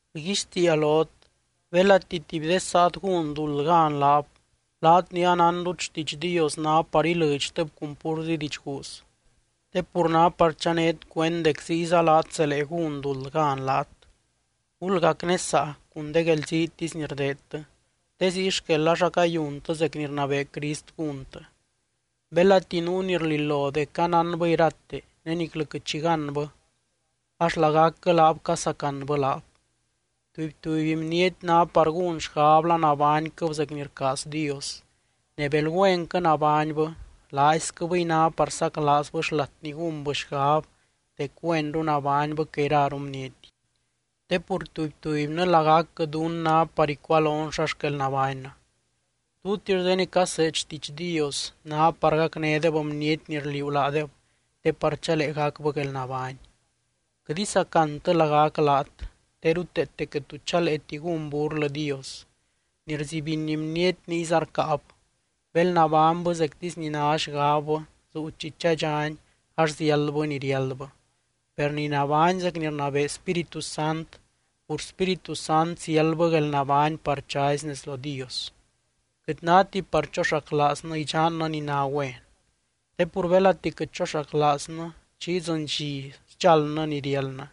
Rguixtiia lot: belati tuby de saat gún duld gan laab, laat ni anánrut xtiidx Dios ná par ilɨdxtɨb cun púrzi didxguuz, te pur ná par chanét cuend dec ziyza laat zelee gún duld gan laat. Gulgacnesaa cun de guelziitisy ni rdeedtɨ, te ziy xquel ax acayuntɨ zec ni rnabee Crist gúntɨ. Belati nuu ni rlilo dec anánbɨ irate ne niclɨ quɨt xi gánbɨ, ax lagacquɨ laab casacanbɨ laab. Tuby, tuby bniety ná par gún xgab la nabányquɨb zec ni rcaaz Dios. Ne bel güenquɨ nabánybɨ, laaisquɨbɨy ná par saclaazbɨ xlat ni gúnbɨ xgab dec güenru nabánybɨ que iraru bniety. Te pur tuby, tubynɨ lagacquɨ dunnɨ ná par icualon xa xquel nabánnɨ. Tutix de ni caseed xtiidx Dios ná par gacnédeb bniety ni rliuu laadeb te par chalee gacbɨ guelnabány. Quɨt isacantɨ lagac laat, te ruteete quɨt tu chaleeti gún burlɨ Dios. Ni rzibiny bniety niyza rcáab. Bel nabánybɨ zectisy ni ná xgabbɨ zuu chi chadxani ax ziáldbɨ ni riáldbɨ. Per ni nabány zec ni rnabee Spíritu Sant, pur Spíritu Sant ziáldbɨ guelnabány par chazy nez lo Dios. Quɨt náti par choxaclaaznɨ idxannɨ ni ná güen. Te pur belati quɨt choxaclaaznɨ, chi idzɨny dxi sdxaldnɨ ni riáldnɨ.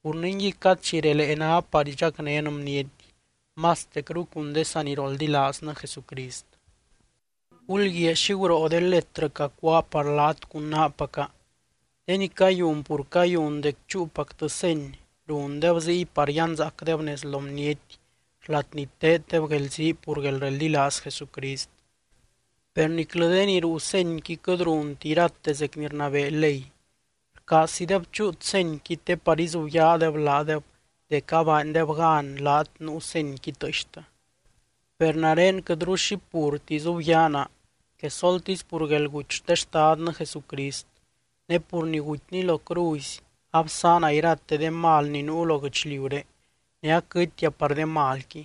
Pur ningui, cad chi relee ná par idxacnén bniety, mastecru cun de saniroldilaaznɨ Jesucrist. Gulguiaa xi guroo de letrɨ cacuáa par laat cun naapaca. De ni cayun pur cayun dec chúupactɨ seny, rundeb ziy par yanzaacdeb nez lo bniety xlat ni teeddeb guelzii pur guelreldilaaz Jesucrist. Per niclɨ de ni ruu senyqui quɨt runti irate zec ni rnii ley. Rcaazzideb chúut senyqui te par izubyaadeb laadeb dec abaandeb gan laat nuu senyqui tɨɨxtɨ. Per nare quɨtru xi purti izubyaa naa, quesoltisy pur guelguty xte Xtadnɨ Jesucrist. Ne pur ni gutyny lo cruzy absaana irate de mal ni nuu lo guɨchliuré ne aquɨtia par de malqui.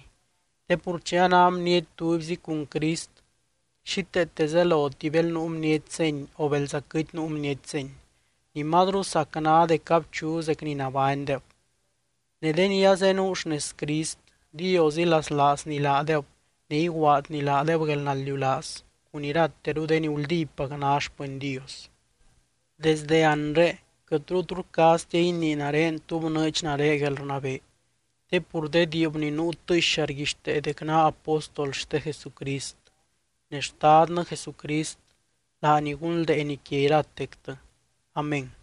Te pur chi a ná bniety tubyzi cun Crist xíteete zeloti bel nuu bniety seny o belza quɨt nuu bniety seny. Ni mazru sac ná dec abchu zec ni nabánydeb. Ne de ni azenuu xnez Crist, Dios ilaslaazny laadeb ne iguaadny laadeb guelnaldiulaaz cun irateru de ni guldípac ná xpɨny Dios. Desdɨ anre quɨtru tu rcaaztia inii nare tú bnɨɨdx nare guelrnabee. Te pur de diib ni nuu tɨɨxa rguixtee dec naa apóstol xte Jesucrist. Ne Xtadnɨ Jesucrist laany gunldeeny quia iratectɨ. Amén.